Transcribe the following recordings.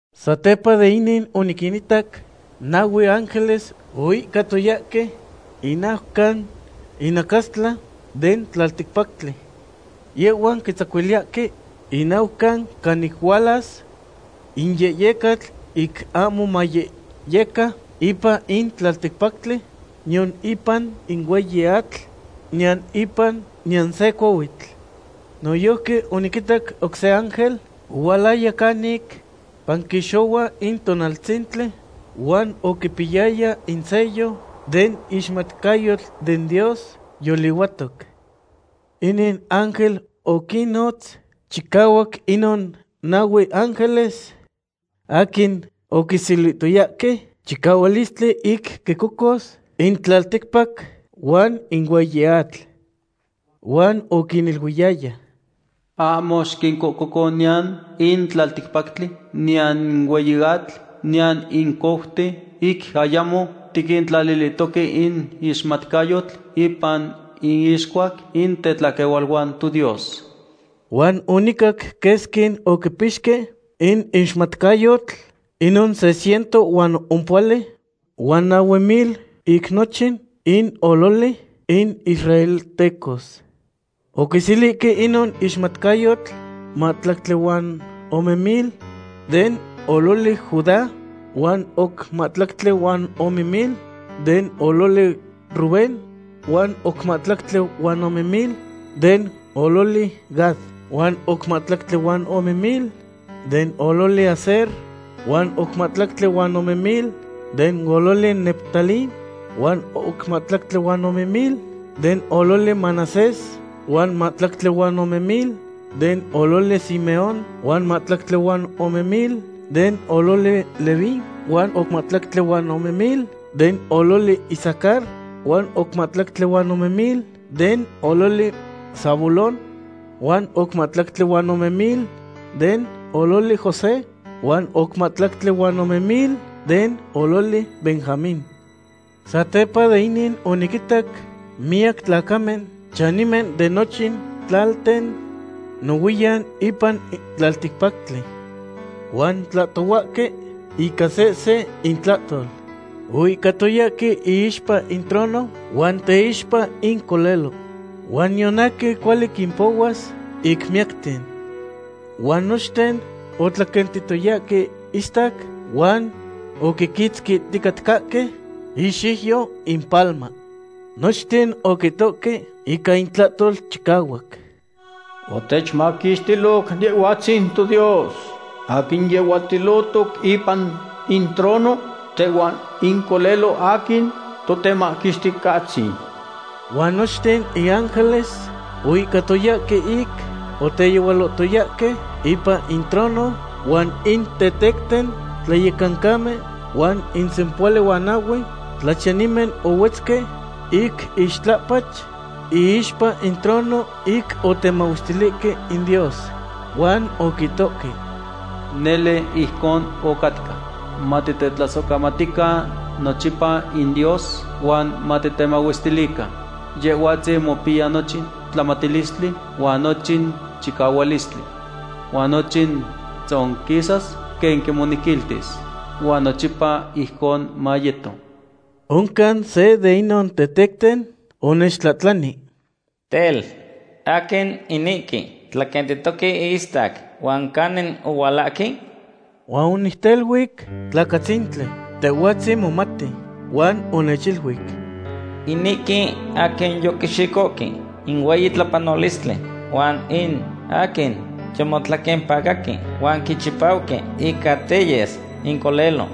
Satepa de inin oniquinitac nahue ángeles oihcatoyahque in naucan inacastla den tlalticpactli. Yehhuan quitzacuiliyahque in naucan canic hualas in yehyecatl ic ahmo mayehyeca ipan in tlalticpactli, niyan ipan in hueyi atl, niyan ipan niyan se cohuitl. Noyojqui oniquitac oc se ángel ohualaya canic panquixohua in tonaltzintli huan oquipiyaya in sello den ixmatcayotl den Dios yolihuatoc. Inin ángel oquinnotz chicahuac inon nahue ángeles aquin oquiselihtoyahque chicahualistli ic quicocos in tlalticpac huan in hueyi atl. Huan oquiniluiyaya: ―Ahmo xiquincoco niyan in tlalticpactli niyan in hueyi atl niyan in couten, ic ayamo tiquintlalilihtoque in ixmatcayotl ipan inixcuac in tetlaquehualuan toDios. Huan onicac quesqui oquipixque in ixmatcayotl, inon se ciento huan ompohuali huan nahue mil ic nochin in ololi in israeltecos. Oquiselihque inon ixmatcayotl mahtlactli huan ome mil den ololi Judá, huan oc mahtlactli huan ome mil den ololi Rubén, huan oc mahtlactli huan ome mil den ololi Gad, huan oc mahtlactli huan ome mil den ololi Aser, huan oc mahtlactli huan ome mil den ololi Neftalí, huan oc mahtlactli huan ome mil den ololi Manasés, huan oc mahtlactli huan ome mil den ololi Simeón, huan oc mahtlactli huan ome mil den ololi Leví, huan oc mahtlactli huan ome mil den ololi Isacar, huan oc mahtlactli huan ome mil den ololi Zabulón, huan oc mahtlactli huan ome mil den ololi José, huan oc mahtlactli huan ome mil den ololi Benjamín. Satepa de inin oniquinitac miyac tlacamen, chanimen de nochin tlalten, nohuiyan ipan tlalticpactli. Huan otlahtohuahque ica sehse intlahtol. Oihcatoyahque iixpa in trono huan teixpa in Colelo. Huan niyan aquin cuali quimpohuas ic miyacten. Huan nochten otlaquentitoyahque istac, huan oquiquitzquihticatcahque ixiuyo impalma. Nochten oquihtohque ica intlahtol chicahuac: Otechmaquixtiloc Yehhuatzin toDios aquin yehuatilohtoc ipan in trono, tehuan in Colelo aquin Totemaquixticahtzin. Huan nochten in ángeles oihcatoyahque ic oteyehualohtoyahque ipan in trono, huan in tetecten tlayecancamen huan in sempohuali huan nahue tlachiyanimen ohuetzque ic ixtlapach iixpa in trono ic otemahuestilihque in Dios. Huan oquihtohque: Nele ijcon ocatca. Matitetlasohcamatican nochipa in Dios, huan matitemahuestilican. Yehhuatzin mopiya nochin tlamatilistli huan nochin chicahualistli. Huan nochin tzonquisas quen quimonequiltis. Huan nochipa ijcon mayeto. Oncan se de inon tetecten onechtlahtlani: ―Tel, ¿aquin inihque tlaquentihtoque ihistac, huan canin ohualahque? Huan onicteluic: ―Tlacatzintli, tehhuatzin momati. Huan onechiluic: ―Inihque aquin yoquixicohque in hueyi tlapanolistli huan in aquin yomotlaquempacahque huan quichipauque ica teyes in Colelo.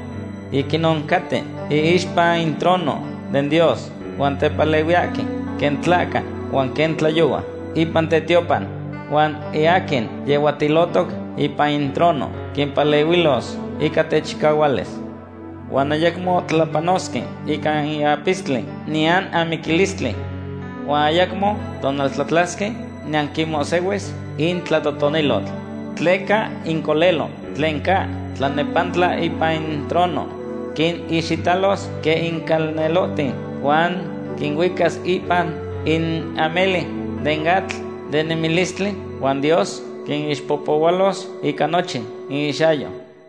Ic inon caten iixpa in trono den Dios huan tepalehuiyahque quen tlahca huan quen tlayohua ipan tetiopan. Huan in aquin yehuatilohtoc ipan in trono quimpalehuilos ica techicahualis. Huan ayacmo tlapanosque ica in apistli niyan amiquilistli. Huan ayacmo tonaltlatlasque, niyan quinmohsihuis in tlatotonilotl. Tleca in Colelo tlen ca tlanepantla ipan in trono quinixitalos quen in calnelohten huan quinuicas ipan in ameli den atl den nemilistli, huan Dios quinixpohpohualos ica nochin inixyayo.